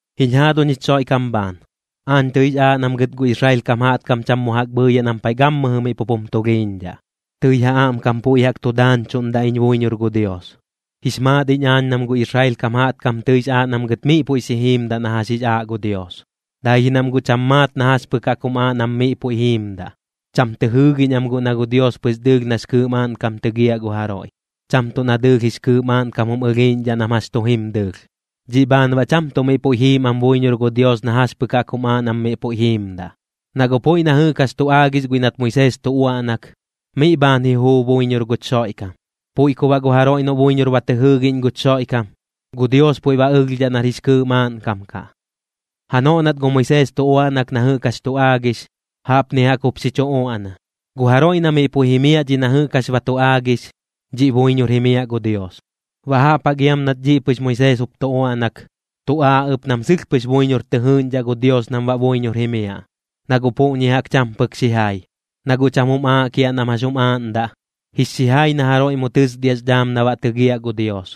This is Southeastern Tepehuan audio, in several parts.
Jiñ jaaduñ jich Xoiꞌkam bhaan, aañ tɨix aaꞌ nam gɨt gu Israel kam jaꞌtkam cham mu jaꞌk bhɨɨyaꞌ nam paiꞌ gammɨjɨ miꞌ pup jum tulhiiñdhaꞌ, tɨi ja aꞌmkam puiꞌ jaꞌk tu daañchuꞌndaꞌ iñ buiñor gu Dios. Jix maat iñ aañ nam gu Israel kam jaꞌtkam tɨix aaꞌ nam gɨt miꞌ puiꞌ xi jiimdaꞌ na jax jix aaꞌ gu Dios, dai ji nam guꞌ cham maat na jax pɨk jaꞌk jum aaꞌ nam miꞌ puiꞌ jiimdaꞌ. Cham tɨ jɨɨgiꞌñ am guꞌ na gu Dios pɨx dɨɨlh nax kɨɨꞌ maaꞌnkam tɨgiaꞌ gu jaroiꞌ, cham tuꞌ na dɨɨlh jix kɨɨꞌ maaꞌnkam jum ɨlhiiꞌñdhaꞌ nam jax tu jim dɨɨlh. Dhiꞌ bhaan baꞌ cham tuꞌ miꞌ puiꞌ jiim am buiñor gu Dios na jax pɨk jaꞌk jum aaꞌ nam miꞌ puiꞌ jiimdaꞌ. Na guꞌ puiꞌ na jɨꞌk jax tu aagix guiꞌ nat Moisees tu uaꞌnak, miꞌ bhaan ji juu buiñor guch Xoiꞌkam. Puiꞌ ku baꞌ gu jaroiꞌ noꞌ buiñor ba tɨ jɨɨgiꞌñ guch Xoiꞌkam, gu Dios puiꞌ ba ɨlhdhaꞌ nar jix kɨɨꞌ maaꞌnkam kaꞌ. Janoꞌ nat gu Moisees tu uaꞌnak na jɨꞌk jax tu aagix, jaꞌpni jaꞌk jup xi chu uaꞌna: “Gu jaroiꞌ na miꞌ puiꞌ jimiaꞌ dhiꞌ na jɨꞌk jax ba tu aagix, dhiꞌ buiñor jimiaꞌ gu Dios.” Baꞌ jaꞌp jaꞌk iam nat dhiꞌ pɨx Moisees jup tu uaꞌnak, tu aaꞌ ɨp nam sɨlh pɨx buiñor tɨ jɨɨꞌñdhaꞌ gu Dios nam baꞌ buiñor jimiaꞌ, na guꞌ puꞌñi jaꞌk cham pɨk xijai. Na guꞌ cham jum aaꞌ kiaꞌ nam jax jum aaꞌndaꞌ: Jix xijai na jaroiꞌ mu tɨsdiaꞌx dhaam na baꞌ tɨgiaꞌ gu Dios,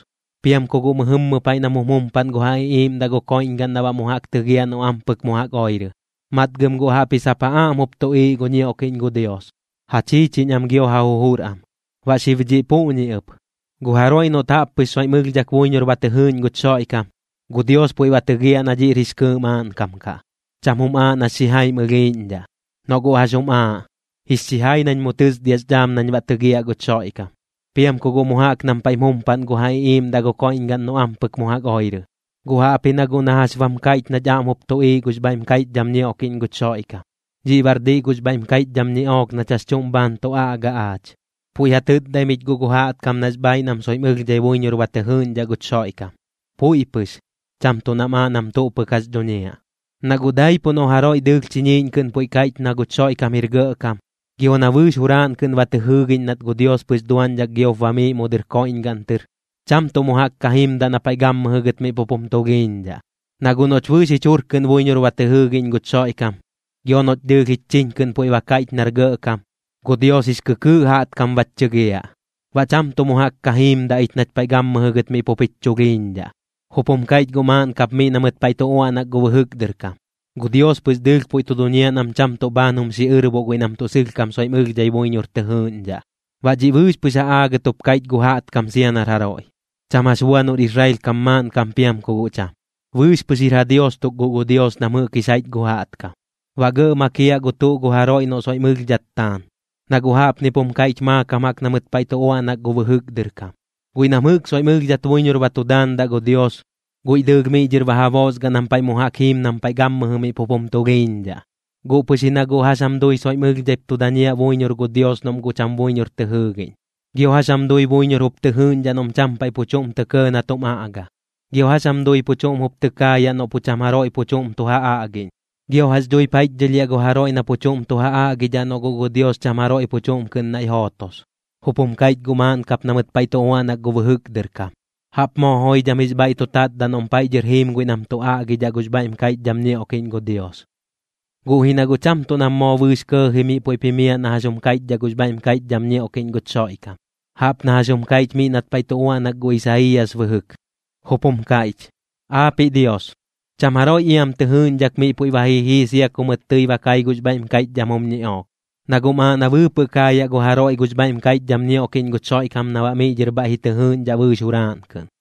piam ku guꞌ mɨjɨmmɨ paiꞌ nam jum jumpaꞌn gu ja iꞌiiꞌmdaꞌ gu koiꞌñgaꞌn na baꞌ mu jaꞌk tɨgiaꞌ noꞌ ampɨk mu jaꞌk oirɨ. Matgɨm guꞌ jaꞌpji sap ja aꞌm nap tuꞌiiꞌ gu ñioꞌkiꞌñ gu Dios, ja chiichiñ am gio ja jujur am. Baꞌ xib dhiꞌ puꞌñi ɨp, gu jaroiꞌ noꞌt jaꞌp pɨx soiꞌm ɨlhdhak buiñor ba tɨ jɨɨꞌñ guch Xoiꞌkam, gu Dios puiꞌ ba tɨgiaꞌ na dhiꞌr jix kɨɨꞌ maaꞌnkam kaꞌ. Cham jum aaꞌ nax xijaim ɨlhiiꞌñdhaꞌ, noꞌ guꞌ jax jum aaꞌ: “Jix xijai nañ mu tɨsdiaꞌx dhaam nañ baꞌ tɨgiaꞌ guch Xoiꞌkam, piam ku guꞌ mu jaꞌk nam paiꞌm jumpaꞌn gu ja iꞌiiꞌmdaꞌ gu koiꞌñgaꞌn noꞌ ampɨk mu jaꞌk oirɨ.” Guꞌ jaꞌpji na guꞌ na jax bam kaiꞌch nach aꞌm jup tuꞌiiꞌ gux bhaiꞌm kaiꞌchdham ñioꞌkiꞌñ guch Xoiꞌkam. Dhiꞌ baꞌr diꞌ gux bhaiꞌm kaiꞌchdham ñiꞌook nach jax chuꞌm bhaan tu aꞌga aach. Puiꞌ ja tɨtdaim ich guꞌ gu jaꞌtkam nax bhaaiꞌ nam soiꞌm ɨlhdhai buiñor ba tɨ jɨɨꞌñdhaꞌ guch Xoiꞌkam, puiꞌ pɨx, cham tuꞌ nam aaꞌ nam tuꞌ pɨk jax dhuñiaꞌ. Naꞌ guꞌ daipuꞌ noꞌ jaroiꞌ dɨɨlh chiñiiꞌñ kɨꞌn puiꞌ ba kaiꞌch na guch Xoiꞌkam jir Gɇꞌkam, gio na bɨɨx juraaꞌn kɨꞌn ba tɨ jɨɨgiꞌñ nat gu Dios pɨx duaꞌñdhak giop bamiiꞌ mu dɨr koiꞌñgaꞌn tɨr, cham tuꞌ mu jaꞌk ka jimdaꞌ na paiꞌ gammɨjɨ gɨt miꞌ pup jum tulhiiꞌñdhaꞌ. Na guꞌ noꞌch bɨɨx jich jur kɨꞌn buiñor ba tɨ jɨɨgiꞌñ guch Xoiꞌkam, gio noꞌch dɨɨlh jich chiñ kɨꞌn puiꞌ ba kaiꞌch nar Gɇꞌkam, gu Dios jix kɨkɨɨꞌ jaꞌtkam bach chɨgiaꞌ, baꞌ cham tuꞌ mu jaꞌk ka jiimdaꞌ ich nach paiꞌ gammɨjɨ gɨt miꞌ pup jich chulhiiñdhaꞌ. Jup jum kaiꞌch guꞌ maaꞌn kap miꞌ na mɨt paiꞌ tu uaꞌnak gu bɨjɨk dɨr kam: “Gu Dios pɨx dɨɨlh puiꞌ tu duñiaꞌ nam cham tuꞌ bhaan jum xiꞌɨꞌrboꞌ guiꞌ nam tuꞌ sɨlhkam soiꞌm ɨlhdhai buiñor tɨ jɨɨꞌñdhaꞌ.” Baꞌ dhiꞌ bɨɨx pɨx ja aagɨt jup kaiꞌch gu jaꞌtkam sia nar jaroiꞌ, cham jax bua noꞌr Israel kam maaꞌnkam piam ku guꞌ cham. Bɨɨx pɨx jir ja Dios tuk guꞌ gu Dios nam jɨꞌk jix jaiꞌch gu jaꞌtkam, baꞌ gɇꞌ makiaꞌ gu tuꞌ gu jaroiꞌ noꞌ soiꞌm ɨlhdhat taan. Na guꞌ jaꞌpnip jum kaiꞌch maakam jaꞌk na mɨt paiꞌ tu uaꞌnak gu bɨjɨk dɨr kam: “Guiꞌ nam jɨꞌk soiꞌm ɨlhdhat buiñor ba tu daandaꞌ gu Dios, guiꞌ dɨɨlh miꞌ dhɨr ba ja boosgaꞌ nam paiꞌ mu jaꞌk jiim nam gammɨjɨ miꞌ pup jum tulhiiñdhaꞌ.” ¿Guꞌ pɨx ji na guꞌ jax jam dui soiꞌm ɨlhdhaip tu dañiaꞌ buiñor gu Dios noꞌm guꞌ cham buiñor tɨ jɨɨgiꞌñ? ¿Gio jax jam dui buiñor jup tɨ jɨɨꞌñdhaꞌ noꞌm cham paiꞌ pu chuꞌm tɇ kɇɇ na tum aꞌga? ¿Gio jax jam dui pu chuꞌm jup tɨ kaayaꞌ noꞌ pu cham jaroiꞌ pu chuꞌm tu ja aꞌgiꞌñ? ¿Gio jax dhuip jaiꞌchdhɨlhiaꞌ gu jaroiꞌ na pu chuꞌm tu ja aꞌgidhaꞌ noꞌ guꞌ gu Dios cham jaroiꞌ pu chuꞌm kɨꞌn naiꞌ jootos? Jup jum kaiꞌch guꞌ maaꞌn kap na mɨt paiꞌ tu uaꞌnak gu bɨjɨk dɨr kam: “¡Jaꞌp moo joidham jix bhaiꞌ tu tatdaꞌ noꞌm paiꞌ dhɨr jiim guiꞌ nam tu aꞌgidhaꞌ gux bhaiꞌm kaiꞌchdham ñioꞌkiꞌñ gu Dios!” Guꞌ ji na guꞌ cham tuꞌ nam moo bɨɨx kɇɇji miꞌ puiꞌp jimiaꞌ na jax jum kaiꞌchdhaꞌ gux bhaiꞌm kaiꞌchdham ñioꞌkiꞌñ guch Xoiꞌkam, jaꞌp na jax jum kaiꞌch miꞌ nat paiꞌ tu uaꞌnak gu Isaiiyas bɨjɨk, jup jum kaiꞌch: “Aapiꞌ Dios, cham jaroiꞌ iam tɨ jɨɨꞌñdhak miꞌ puiꞌ ba ji jii sia ku mɨt tɨi ba kai gux bhaiꞌm kaiꞌchdham jum ñiꞌook.” Na guꞌm aaꞌ na bɨɨpɨꞌ kaayaꞌ gu jaroiꞌ gux bhaiꞌm kaiꞌchdham ñioꞌkiꞌñ guch Xoiꞌkam na baꞌ miꞌ dhɨr bhaiꞌ ji tɨ jɨɨꞌñdhaꞌ bɨɨx juraaꞌn kɨꞌn.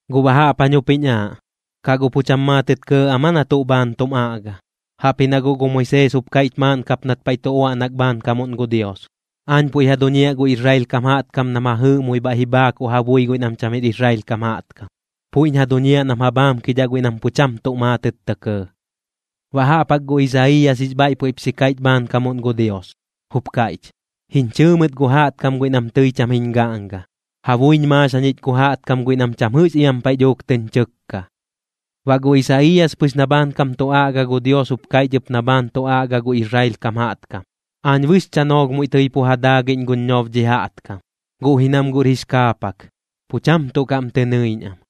Guꞌ baꞌ jaꞌp jañ jup jiñ aaꞌ: ¿Kaꞌ guꞌ pu cham maatɨt kɇɇ am aa na tuꞌ bhaan tum aꞌga? Jaꞌpji na guꞌ gu Moisees jup kaiꞌch maaꞌn kap nat paiꞌ tu uaꞌnak bhaankamuꞌn gu Dios: Aañ puiꞌ ja duñiaꞌ gu Israel kam jaꞌtkam nam ja jɨɨꞌmui bhaiꞌ ji bhaakuꞌ ja bui guiꞌ nam cham jir Israel kam jaꞌtkam, puiꞌñ ja duñiaꞌ nam ja bhaamkidhaꞌ guiꞌ nam pu cham tuꞌ maatɨt tɇ kɇɇ. Baꞌ jaꞌp jaꞌk gu Isaiiyas jix bhaiꞌ puiꞌp xi kaiꞌch bhaankamuꞌn gu Dios, jup kaiꞌch: Jiñ chɨɨ mɨt gu jaꞌtkam guiꞌ nam tɨi cham jiñ gaꞌnga, ja buiñ maax jañich gu jaꞌtkam guiꞌ nam cham jɨꞌx iam paiꞌ dhuuk tɨñ chɨkka. Baꞌ gu Isaiiyas pɨx na bhaankam tu aꞌga gu Dios jup kaiꞌch ɨp na bhaan tu aꞌga gu Israel kam jaꞌtkam: “Aañ bɨx chanoolh muiꞌ tɨi pu ja daagiꞌñ guñ ñob dhi jaꞌtkam, guꞌ ji nam guꞌr jix kaapak, pu cham tuꞌ kaꞌm tɨ nɨiꞌñ am.”